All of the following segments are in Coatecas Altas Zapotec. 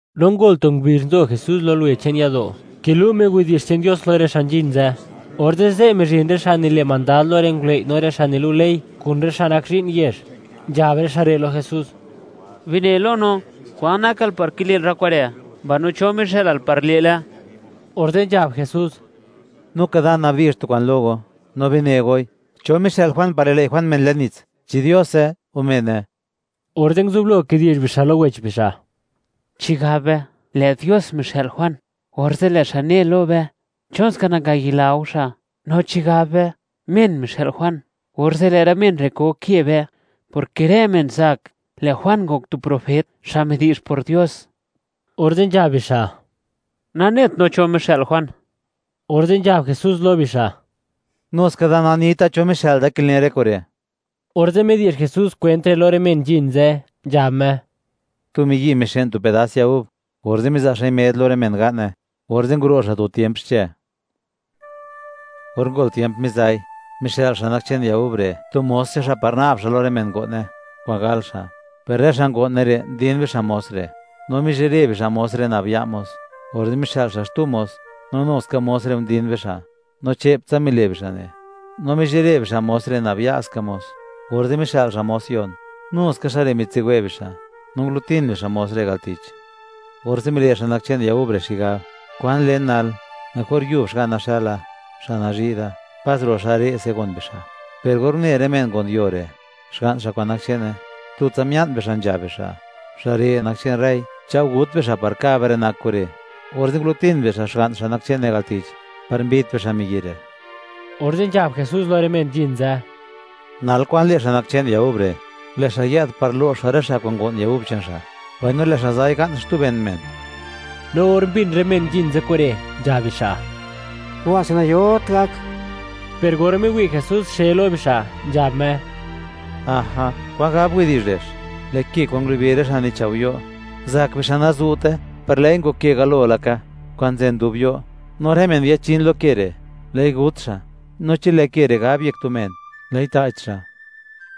No ngol tu ngubizh, nzo Jesús lo luwe che'n yado', kilu' Me widi'zh che'n Dios lo rë xa' nzhin ze', orze' ze', mizhin rë xa' nile' mandad lo rë ngulëi', no rë xa' nilu' ley, kun rë xa' nak zhi'n yezh, nzhab rë xa' re' lo Jesús: ―Bine lo no, ¿kwan nakal par kile'l rë kure', mbaino cho mixë'lal par le'le? Orze' nzhab Jesús: ―Nuka da, nabdi'zh tu kwa'n lo go, no bine goi: ¿Cho mixë'l Juan par lilëi' Juan men le'n nits? ¿Chi Diose, o mene? Orze' nguzublo kidi'zh bixa' lo wech bixa': ―Chi gab be: “Lë' Dios mixë'l Juan”, orze' lë' xa' ne lo be: “¿Chonska nangayila go xa'?” No chi gab be: “Men mixë'l Juan”, orze' lë' rë men re' koke be, porke rë men zak, lë' Juan ngok tu profet, xa' midi'zh por Dios. Orze' nzhab bixa': ―Nanet no cho mixë'l Juan. Orze' nzhab Jesús lo bixa': ―Nuska da, nanita cho mixë'l da kilen rë kure'. Orze' midi'zh Jesús kwent re', lo rë men nzhin ze', nzhab Me: ―Tu miyi' mixë'n tu pedas ya gub, orze' miza' xa'i med lo rë men ga'ne; orze' nguro' xa' tu tiemp xche. Or ngol tiemp miza'i, mixë'l xa' nak che'n ya gub re', tu mos che'n xa' par na'b xa' lo rë men ngo'ne, kwa'n gal xa'. Per rë xa' ngo'ne re', ndin bixa' mos re', no mizhire bixa' mos re' nab ya' mos. Orze' mixë'l xa' xtu mos, no nu ska mos re' ndin bixa', no che'ptsa mile' bixa' ne', no mizhire bixa' mos re', nab ya' ska mos. Orze' mixë'l xa' mos yon; nu ska xa' re' mitsiwe' bixa', no ngulutin bixa' mos re' al tich. ’Orze' mile' xa' nak che'n ya gub re' xigab: “¿Kwan len nal? Mejor yub xga'na xëla, xa' nazhi' da, pas ro' xa' re'se gon bixa'.” Per or une rë men ngo'n yuo re', xga'n xa' kwa'n nak che'ne, tutsa mia'n bixa' nzhab bixa': “Xa' re' nak che'n rëi; chao' gut be xa', par ka' be rë nak kure'.” Orze' ngulutin bixa', xga'n xa' nak che'ne al tich, par mbit bixa' miyi' re'. Orze' nzhab Jesús lo rë men nzhin ze': ―Nal, ¿kwan le' xa' nak che'n ya gub re'? Lë' xa' yë'd par lo'x xa' rë xa' kwa'n ngo'n ya gub che'n xa', mbaino lë' xa' za'i ga'n xtu ben men. No or mbin rë men nzhin ze' kure', nzhab bixa': ―¡Kuba'se nayot gak! Per or miwi' Jesús xe lo bixa', nzhab Me: ―Aja, kwan gab widi'zh kwan nzobni' re'x: Lë' ke kwa'n ngulubi rë xa' nichao' yo', zak bixa' nazu'te, per lë'i ngok ke galo laka, kwa'n nzen dub yo'. No rë men yachin lo ke re', lë'i gut xa'; no chi lë' ke re' gab yek tu men, lë'i ta'ch xa'.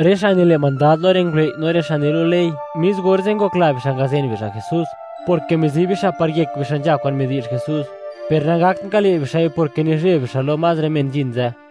Rë xa' nile' mandad lo rë ngulëi', no rë xa' nilu' ley; mis orze' ngokla bixa' ngazen bixa' Jesús, porke mizi bixa' par yek bixa' nzha kwa'n midi'zh Jesús. Per nangakt ngale' bixa'i, porke nizheb bixa' lo más rë men nzhin ze'.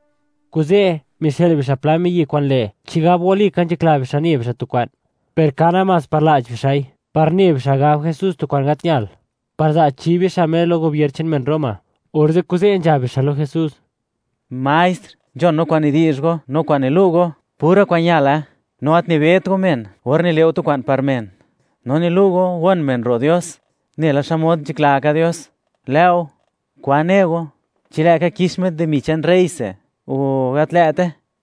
Kuze', mixë'l bixa' pla miyi' kwa'n le', chigab walika nzhakla bixa' ne bixa' tu kwa'n, per ka namás par la'ch bixa'i, par ne bixa' gab Jesús tu kwa'n gat ñal, par za' chi bixa' Me lo gobier che'n men Roma. Orze' kuze' nzhab bixa' lo Jesús: ―Maestr, nzhon no kwa'n nidi'zh go, no kwa'n nilu' go, pura kwa'n ñale; no gat nibet go men or nile' go tu kwa'n par men; no nilu' go gon men ro' Dios nela xmod nzhakla ka Dios. Lë'o, ¿kwan ne go? ¿Chi lë'ka kix met dimi che'n rreyse, o gat lë'te?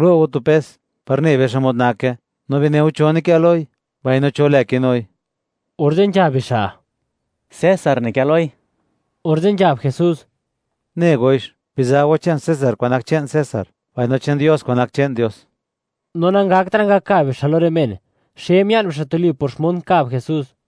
Gulo' go tu pes, par ne be xmod nake. No bineu, ¿cho nikë loi, mbaino cho lë kinui? Orze' nzhab bixa': ―César nikë loi. Orze' nzhab Jesús: ―Ne goix, biza' go che'n César kwa'n nak che'n César; mbaino che'n Dios kwa'n nak che'n Dios. No nangaktra' ngakab bixa' lo rë men; xe mia'n bixa' tuli por xmod nkab Jesús.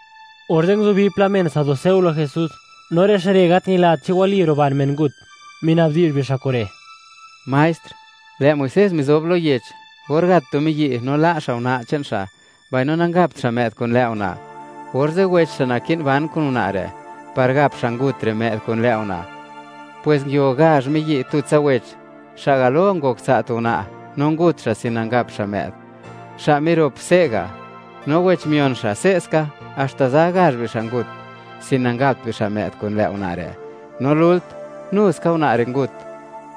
Orze' nguzubi pla men saduceo lo Jesús, no rë xa' re' gat ñilat chi wali ruban men ngut, minabdi'zh bixa' kure': ―Maestr, lë' Muisés mizob lo yech, or gat tu miyi' no la' xa' una' che'n xa', mbaino nangapt xa' më'd kun lë' una', orze' wech xa' naki'n ban kun una' re' par gap xa' ngut re' më'd kun lë' una'. Pwes nguio gazh miyi' tutsa wech; xa' galo ngok tsa' tu una', no ngut xa' sin nangap xa' më'd. Xa' mirop se'ga', no wech mion xa' se'ska, haxta za gazh bixa' ngut, sin nangapt bixa' më'd kun lë' una' re'. No lult, nu ska una' re' ngut.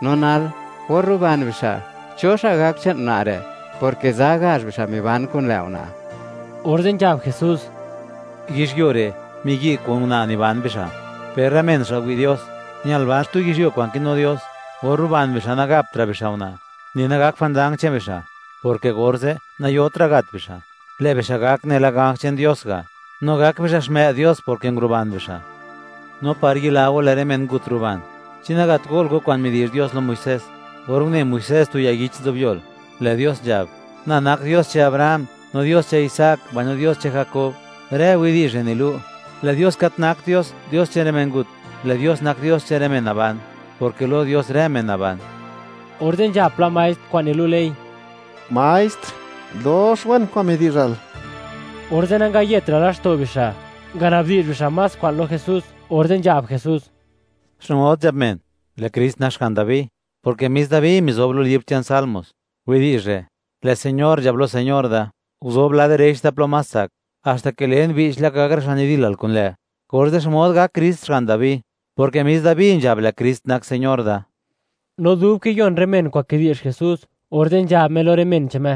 No nal, or ruban bixa', ¿cho xa' gak che'n una' re'?, porke za gazh bixa' miban kun lë' una'. Orze' nzhab Jesús: ―Yizhyuo re', miyi' kun una' niban bixa', per rë men xa' wi' Dios, ñal ban xtu yizhyuo kwa'n kinu Dios, or ruban bixa', nagaptra' bixa' una', ni nagak jwandang che'n bixa', porke orze', nayotra' gat bixa', lë' bixa' gak nela ganj che'n Dios ga', no gak bixa' xmë'd Dios porke nguruban bixa'. No par yila go lë' rë men ngut ruban, ¿chi nagat go'l go, kwa'n midi'zh Dios lo Muisés, or une Muisés tu ya yich nzobyol? Lë' Dios nzhab: “Na nak Dios che'n Abraham, no Dios che'n Isaac, mbaino Dios che'n Jakob.” Rë widi'zh re' nilu', lë' Dios gat nakt Dios, Dios che'n rë men ngut; lë' Dios nak Dios che'n rë men naban; porke lo Dios rë men naban. Orze' nzhab pla maestr xa' nilu' ley: ―Maestr, dox wen kwa'n midi'zhal. Orze' nangayetra' laxto' bixa', nganabdi'zh bixa' más kwa'n lo Jesús. Orze' nzhab Jesús: ―¿Xmod nzhab men, lë' Krist nak xga'n Dabi?, porke mis Dabi mizob lo libr che'n Salmos widi'zh re': Lë' Señor nzhab lo Señor da: “Guzob lad direch da plo más tsak, haxta ke len, che'ptsa (bi'ch laka) gak rë xa' nidilal kun lë'.” Orze', ¿xmod gak Krist Xga'n Dabi?, porke mis Dabi nzhab: “Lë' Krist nak Señor da.” No dub kiyon rë men kwa'n kidi'zh Jesús, orze' nzhab Me lo rë men che'n Me: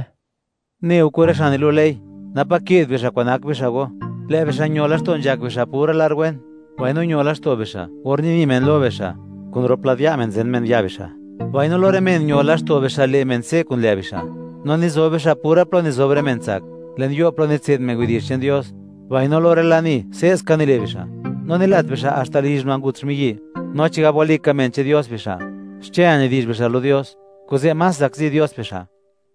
―Neu kun rë xa' nilu' ley, napa' ke'd bixa' kwa'n nak bixa' go. Lë' bixa' ño laxto' nzhak bixa' pura lar wen, mbaino ño laxto' bixa', or nini' men lo bixa', kun rop lad ya' men zen men ya' bixa', mbaino lo rë men ño laxto' bixa' le' men se' kun lë' bixa'; no nizob bixa' pura plo nizob rë men tsak, le'n yo' plo nitse'd men widi'zh che'n Dios, mbaino lo rë lani, se'ska nile' bixa'. No nilat bixa' haxta lizh una' ngut xmiyi'. No chigab walika men che'n Dios bixa', xche nidi'zh bixa' lo Dios; kuze' más zakzi Dios bixa'.